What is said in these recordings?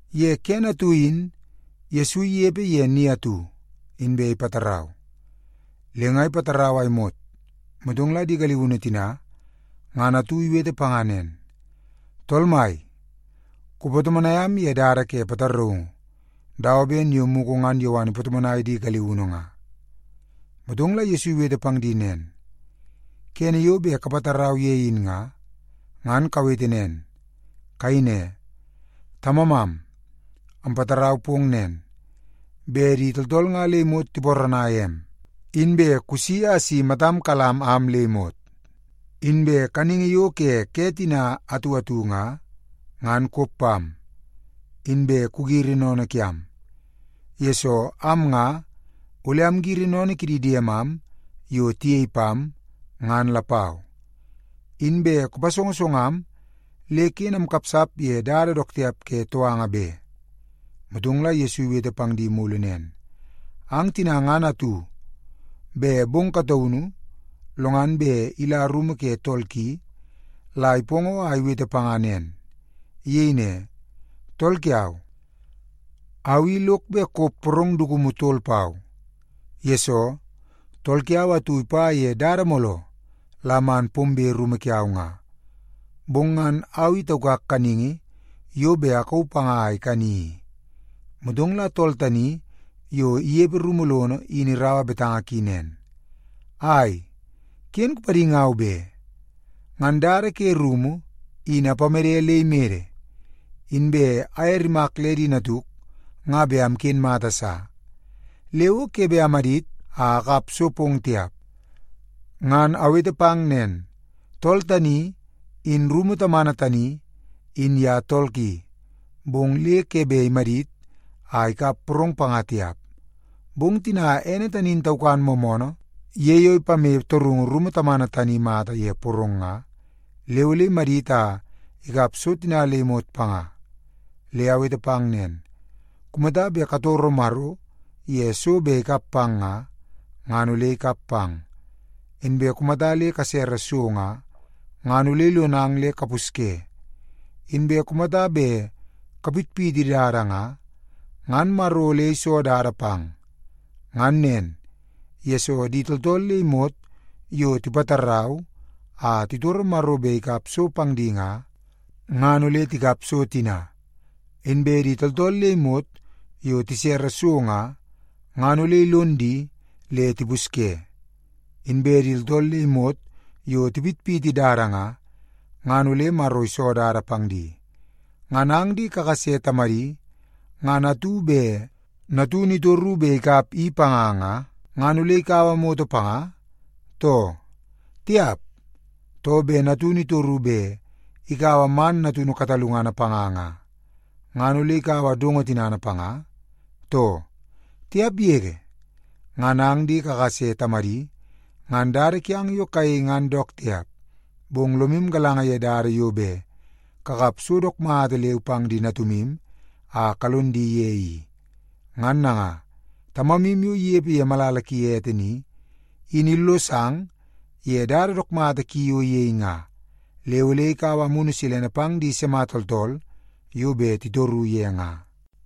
Ye kene atu in Yesu inepe ye ni atu, inbe ipatarau. Le nga ipatarau a imot, motong la di galiunu tina ngan atu iwete panga nen, “Tool Mai, kupatomonai am ye dada ke pataraungu dawa ben yo mugu ngan Yowan ipatomonai di galiunu nga.” Motong la Yesu iwete pang di nen, “Kene yo bet kapatarau ye in nga, ngan kawete nen. Kayei ne, ‘Tamamam, ampatarau pong nen, bet di tooltool nga le imot tiparanaia em, inbe kusi a si matam kalam am le imot. Inbe kaningi yo ke ke tina atu atu nga, ngan kop pam. Inbe kugiri sennene kiam, yesoo am nga ole amgiri sennene kidi diemam yo tiyei pam, ngan lapau. Inbe kupasongosongam le ken amkapsap ye dada dook tiap ke touanga be.’” Motong la Yesu iwete pang di mulu nen, “Ang tina ngan atu, bet bong kataunu lo ngan bet ila rumu ke tool ki la ipoongoo a iwete panga nen. Iyei ne, ‘Tool kiau, au i lok bet kop porong dukumu tol pau. Yesoo, tool kiau atu ipa ye dada mooloo la le man pombe rumu kiau nga. Bong ngan au i taukak kaningi yo bet akauu panga a ikani i.’ Motong la tool tani yo inepe rumu lono in iraua betanga ki nen, ‘Ai, ken kupadingau be. Ngan dada ke rumu in apamede le imede, inbe aye rimak le di natuk nga bet amken mata sa. Le o ke bet amadit a akap so pong tiap.’ Ngan awete pang nen, tool tani, in rumu tamana tani, in ye tool ki, bong le ke bet imadit a ikap porong panga tiap. Bong tina ene tani in taukan moomoonoo ye yo ipame torungu rumu tamana tani mata ye porong nga, le ole imadit a ikap so tina le imot panga. Le awete pang nen, kumata bet katoro Maro ye so bet ikap pang nga, ngan ole ikap pang. Inbe kumata le kasere so nga, ngan ole ilonang le kapusye. Inbe kumata bet kapitpiti dada nga, ngan Maro ole iso dada pang. Ngan nen, yesoo di tooltool le imot yo tipatarau a titoro Maro bet ikap so pang di nga, ngan ole tikap so tina. Inbe di tooltool le imot yo tisere so nga, ngan ole ilon di le tipusye. Inbe di tooltool le imot yo tipitpiti dada nga, ngan ole Maro iso dada pang di. Ngan ang di kakase tamadi ngan atu bet natunu itoru bet ikap i panga nga, ngan ole ikaua moto panga, too? Tiap! Too, bet natunu itoru bet ikaua man natunu katalungana panga nga, ngan ole ikaua dongo parangana panga, too? Tiap yege! Ngan ang di kakase tamadi ngan dada kiang yo kayei ngan dook tiap, bong lomu galanga ye dada yo bet kakap so dook mata leu pang di natumu a kalon di ye i. Ngan nanga, Tamamu yo inepe ye malala ki ete ni, in illosang ye dada dook mata ki yo iyei nga, le ole ikaua Amunu Silene pang di sima tooltool yo bet titoru ye nga.”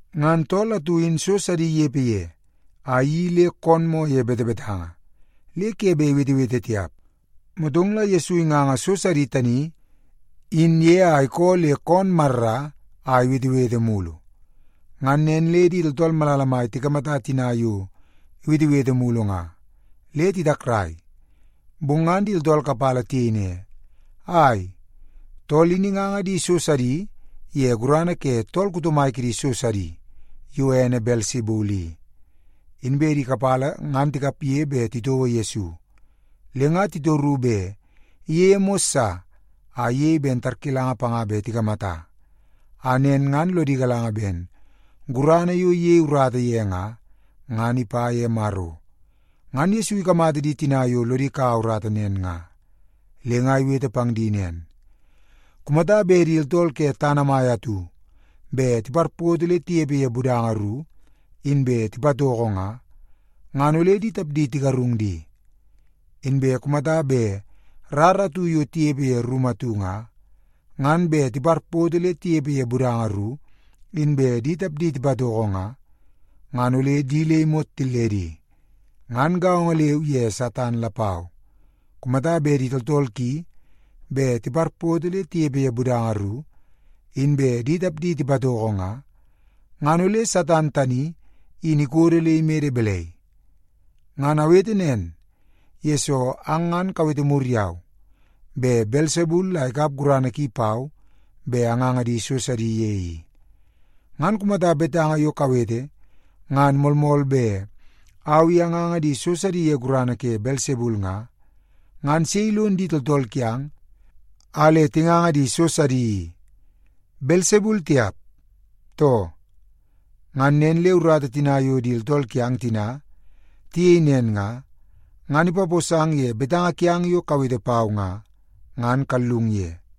Ngan tool atu in so sidi inepe ye a iyeii le koon moo ye betebetanga le ke bet iwetewete tiap. Motong la Yesu inganga so sidi tani in ye a ikoo le koon marra a iwetewete mulu. Ngan nen le di tooltool malala mai tikamata tina yo iwetewete mulu nga, le titakrai. Bong ngan di tooltool kapala tiyei ne, “Ai, tool in inganga di so sidi ye gurana ke tool kuto mai kidi so sidi yo ene Belsebul i.” Inbe di kapala ngan tikapge bet titouo Yesu, le nga titoru bet iyeie mos sa a iyei ben tarkilanga panga bet tikamata, a nen ngan lodi galanga ben gurana yo iyei urata ye nga, ngan ipa ye Maro. Ngan Yesu ikamata di tina yo lodi kaua urata nen nga, le nga iwete pang di nen, “Kumata bet di tooltool ke tana mai atu bet tiparpoto le tinepe ye budanga ru, inbe tipatoko nga, ngan ole di tapdi tigarung di. Inbe kumata bet rara atu yo tinepe ye rumu atu nga, ngan bet tiparpoto le tinepe ye budanga ru, inbe di tapdi tipatoko nga, ngan ole di le imot tilledi. Ngan gaongo leu ye Satan lapau. Kumata bet di tooltool ki bet tiparpoto le tinepe ye budanga ru, inbe di tapdi tipatoko nga, ngan ole Satan tani in ikodo le imede balai? Ngan awete nen, yesoo ang ngan kawete mur yau bet Belsebul la ikap gurana ki pau bet anganga di so sidi ye i. Ngan kumata betanga yo kawete ngan moolmool bet au i anganga di so sidi ye gurana ke Belsebul nga, ngan sei ilon di tooltool kiang a le tinganga di so sidi i? Belsebul tiap, too? Ngan nen le urata tina yo di tooltool kiang tina tiyei nen nga, ngan ipaposang ye betanga kiang yo kawete pau nga, ngan kallung ye.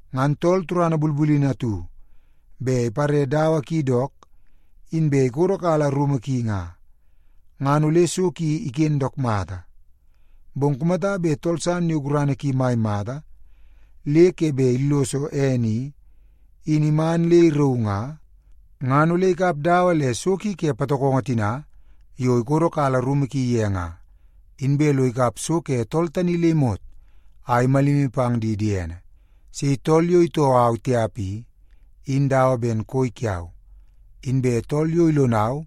“Ngan tool turana bulbulini atu bet ipare dawa ki dook inbe ikodokala rumu ki nga, ngan ole so ki iken dook mata. Bong kumata bet tool san yo gurana ki mai mata le ke bet illoso ene i, in iman le irauu nga, ngan ole ikap dawa le so ki ke patokongo tina yo ikodokala rumu ki ye nga, inbe lo ikap so ke tool tani le imot a imalimi pang di diene. “Sei tool yo itoo au tiap i, in dawa ben koi kiau. Inbe tool yo ilonau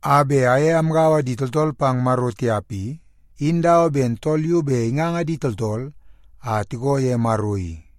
a bet aye amgaua di tooltool pang Maro tiap i, in dawa ben tool yo bet inganga di tooltool a tikoo ye Maro i.”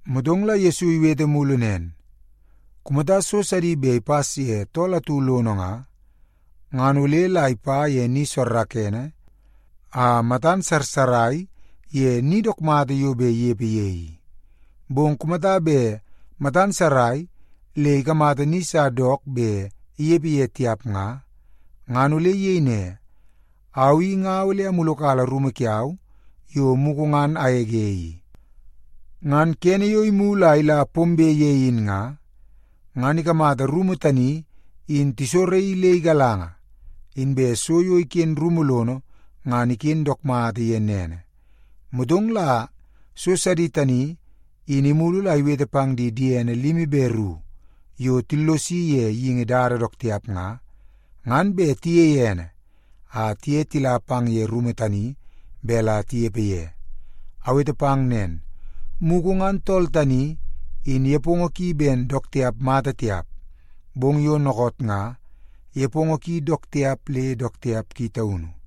Motong la Yesu iwete mulu nen, “Kumata so sidi bet ipas ye tool atu lono nga, ngan ole la ipa ye ni soorookoonoo a matan sarsarai ye ni dook mata yo bet inepe ye i. Bong kumata bet matan sarai le ikamata ni sa dook bet inepe ye tiap nga, ngan ole iyei ne, ‘Au i nga ole amulukala rumu kiau yo mugu ngan agege i.’ Ngan kene yo imulu a ila pombe ye in nga, ngan ikamata rumu tani in tisoraii le igalanga, inbe so yo iken rumu lono nga iken dook mata ye nene. Motong la so sidi tani in imulu la iwete pang di diene limi be ru yo tillosi ye geingi dada dook tiap nga, ngan bet tiyei ene a tiye tila pang ye rumu tani bet la tinepe ye. Awete pang nen, mugu ngan tool tani in nepongo ki ben dook tiap mata tiap, bong yo dookoot nga nepongo ki dook tiap le dook tiap ki taunu.”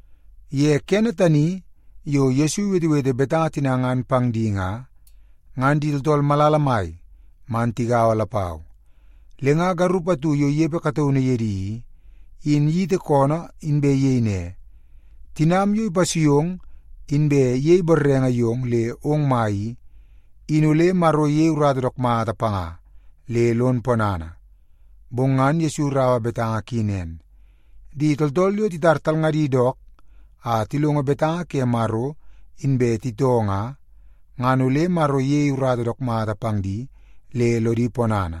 Ye kene tani yo Yesu iwetewete betanga tina ngan pang di nga, ngan di tooltool malala mai man tigaua lapau, le nga garup atu yo inepe kataunu ye di i, in iyiti koonoo inbe iyei ne, “Tinam yo ipasui ong inbe iyei borrenge yong le ong mai i, in ole Maro iyei urata dook mata panga le lon ponana.” Bong ngan Yesu iraua betanga ki nen, “Di tooltool yo titar talngadi dook a tilongo betanga ke Maro inbe titoo nga, ngan ole Maro iyei urata dook mata pang di le lodi ponana.”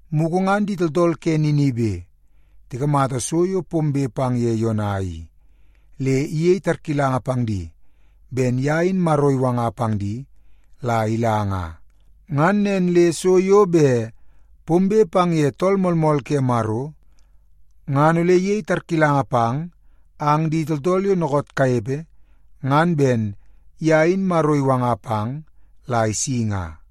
Mugu ngan di tooltool ke Ninibe tikamata so yo pombe pang ye Yona i, le iyei tarkilanga pang di ben ye in Maro iwanga pang di la ila nga. Ngan nen le so yo bet pombe pang ye Tool Moolmool ke Maro ngan ole iyei tarkilanga pang ang di tooltool yo dookoot kanepe ngan ben ye in Maro iwanga pang la isi nga.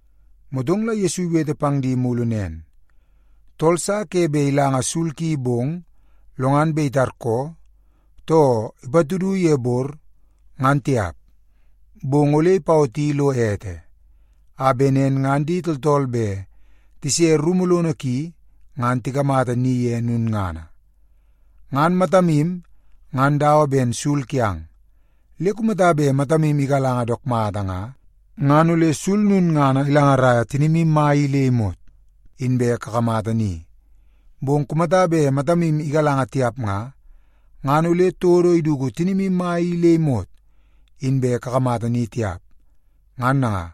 Motong la Yesu iwete pang di mulu nen, “Tool sa ke bet ilanga sul ki bong, lo ngan bet itarkoo, too ipatudu ye bor, ngan tiap. Bong ole ipawoti lo ete, a bet nen ngan di tooltool bet tise rumu lono ki ngan tikamata ni ye lulngana. Ngan matamu ngan dawa ben sul kiang. Le kumata bet matamu igalanga dook mata nga, ngan ole sul lulngana ilangaraia tinimu mai i le imot inbe kakamata ni. Bong kumata bet matamu igalanga tiap nga, ngan ole todo iduku tinimu mai i le imot inbe kakamata ni tiap. Ngan nanga,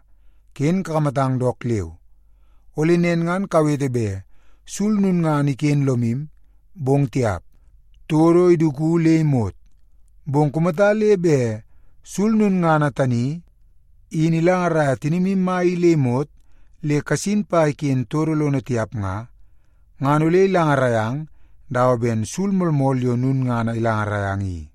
ken kakamatang dook leu, ole nen ngan kawete bet sul lulngana iken lomu, bong tiap, todo iduku le imot. Bong kumata le bet sul lulngana tani in ilangaraia tinimu mai i le imot, le kasin pa iken todo lono tiap nga, ngan ole ilangarai ang dawa ben sul moolmool yo lulngana ilangarai ang i.”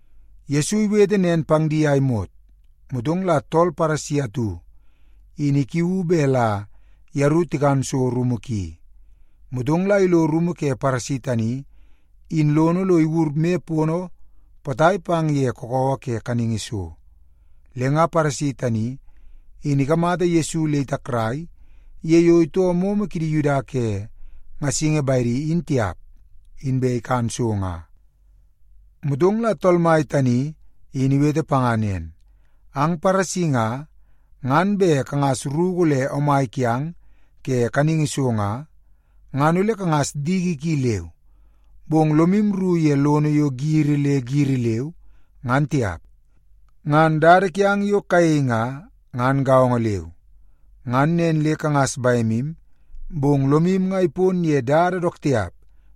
Yesu iwete nen pang di a imot, motong la tool Paresi atu in ikiuu bet la yeru tikan so rumu ki. Motong la ilo rumu ke Paresi tani in lono lo iwur moi pono potai pang ye kakawa ke kaningi so. Le nga Paresi tani in ikamata Yesu le itakrai ye yo itoo momo kidi Yuda ke ngasingi bedi in tiap, inbe ikan so nga. Motong la Tool Mai tani in iwete panga nen, “Ang Paresi nga, ngan bet kangas ruku le omai kiang ke kaningi so nga, ngan ole kangas diki ki leu. Bong lomu rru ye lono yo giri le giri leu, ngan tiap. Ngan dada kiang yo kayei nga, ngan gaongo leu. Ngan nen le kangas bemu, bong lomu nga ipon ye dada dook tiap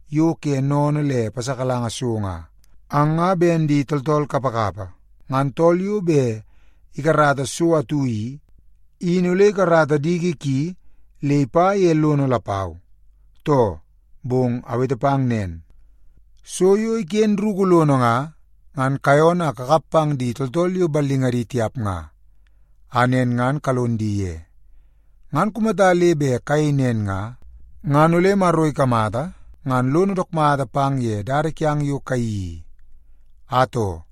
yo ke sennene le pasakalanga so nga. Ang nga ben di tooltool kapakapa! Ngan tool yo bet ikarata so atu i, in ole ikarata diki ki le ipa ye lono lapau, too? Bong awete pang nen, so yo iken ruku lono nga, ngan kayoon a kakap pang di tooltool yo ballingadi tiap nga, a nen ngan kalon di ye. Ngan kumata le bet kayei nen nga, ngan ole Maro ikamata ngan lono dook mata pang ye dada kiang yo kayeii i. “Atoo,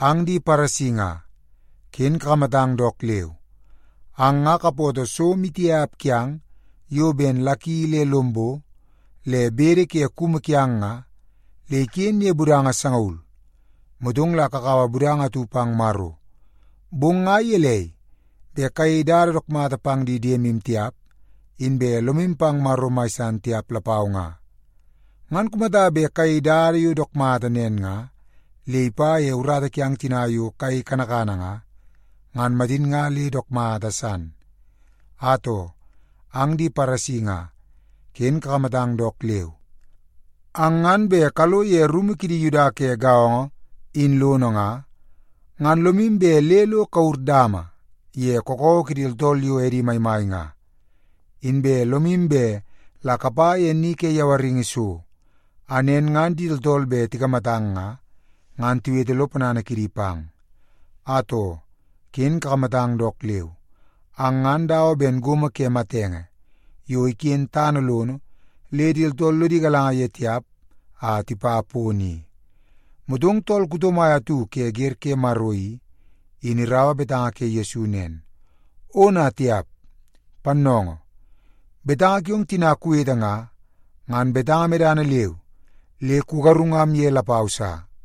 ang di Paresi nga, ken kakamatang dook leu! Ang ngan kapoto so maitiap kiang yo ben laki le lombo le kudu ke kumu kiang nga, le iken ye budanga sangaul, motong la kakaua budanga atu pang Maro. Bong nga gelei bet kakarata betanga ke di diemu ye dada yo dook mata moolmool nga tiap, inbe lomu pang Maro mai san tiap lapau nga? Ngan kumata bet kayei dada yo dook mata nen nga, le ipa ye urata kiang tina yo kayei kanakana nga, ngan matin nga le dook mata san. “Atoo, ang di Paresi nga, ken kakamatang dook leu! Ang ngan bet kalo ye rumu kidi Yuda ke gaongo in lono nga, ngan lomu bet le lo kawur dama ye kakawa kidi tooltool yo edi maimai nga. Inbe lomu bet la kapa ye ni ke yawaringi so, a nen ngan di tooltool bet tikamatang nga, ngan tiwete lo ponana kidi pang. “Atoo, ken kakamatang dook leu! Ang ngan dawa ben gomo ke matenge yo iken tana lono le di tooltool lodi galanga ye tiap a tipa pono i.” Motong tool kuto mai atu ke wer ke Maro i, in iraua betanga ke Yesu nen, “Ona tiap! Pannoongoo, betanga kiong tina kuwete nga, ngan betanga medana leu le kugarungam ye lapau sa.”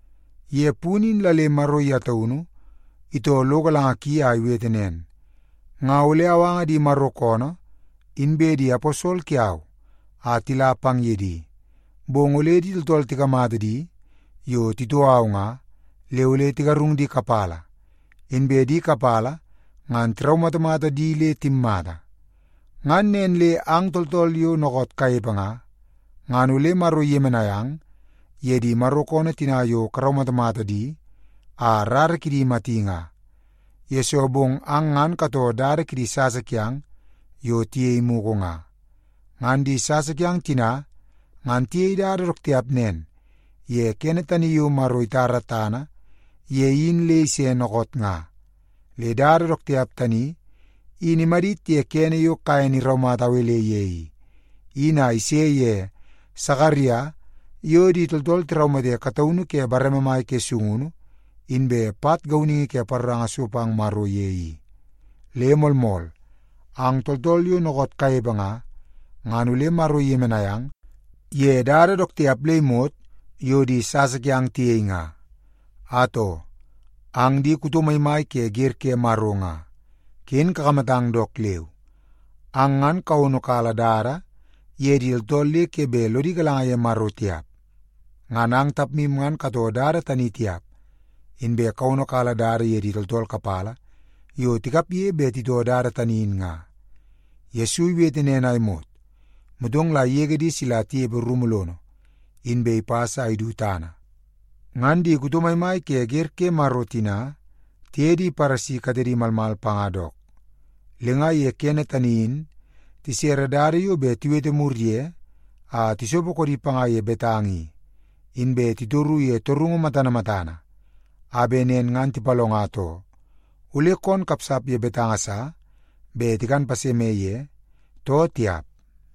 Ye punu in la le Maro ye taunu itoo lo galanga ki a iwete nen, ‘Nga ole awanga di Maro koonoo inbe di aposol kiau a tila pang ye di, bong ole di tooltool tikamata di yo titoo au nga, le ole tigarung di kapala, inbe di kapala ngan tiraumatamata di le timmata.’ Ngan nen le ang tooltool yo dookoot kanepe nga, ngan ole Maro iyemenai ang ye di Maro koonoo tina yo karaumatamata di a rara kidi imati nga, yesoo bong ang ngan katoo dada kidi sasa kiang yo tiyei mugu nga. Ngan di sasa kiang tina ngan tiyei dada dook tiap nen ye kene tani yo Maro itara tana ye in le se dookoot nga. Le dada dook tiap tani in imadit ye kene yo Kaen iraumata Awel ye i, in le ise ye Sakaria yo di tooltool tiraumate kataunu ke bareme mai ke sungunu inbe pat gauningi ke paroranga so pang Maro ye i. Le moolmool, ang tooltool yo dookoot kanepe nga, ngan ole Maro iyemenai ang ye dada dook tiap le imot yo di sasa kiang tiyei nga. “Atoo, ang di kuto maimai ke wer ke Maro nga, ken kakamatang dook leu! Ang ngan kawono kala dada ye di tooltool le ke bet lodi galanga ye Maro tiap. Ngan ang tapmu ngan katoo dada tani tiap, inbe kawono kala dada ye di tooltool kapala yo tikapge bet titoo dada tani in nga.” Yesu iwete nen a imot, motong la igege di sila tinepe rumu lono, inbe ipas a idu tana. Ngan di kuto maimai ke wer ke Maro tina tiye di Paresi katedi malmal panga dook, le nga ye kene tani in tisere dada yo bet tiwete mur ye a tisopo koodi panga ye betanga i, inbe titoru ye torungu matana matana, a bet nen ngan tipalonga too, ole koon kapsap ye betanga sa bet tikan paseme ye, too tiap.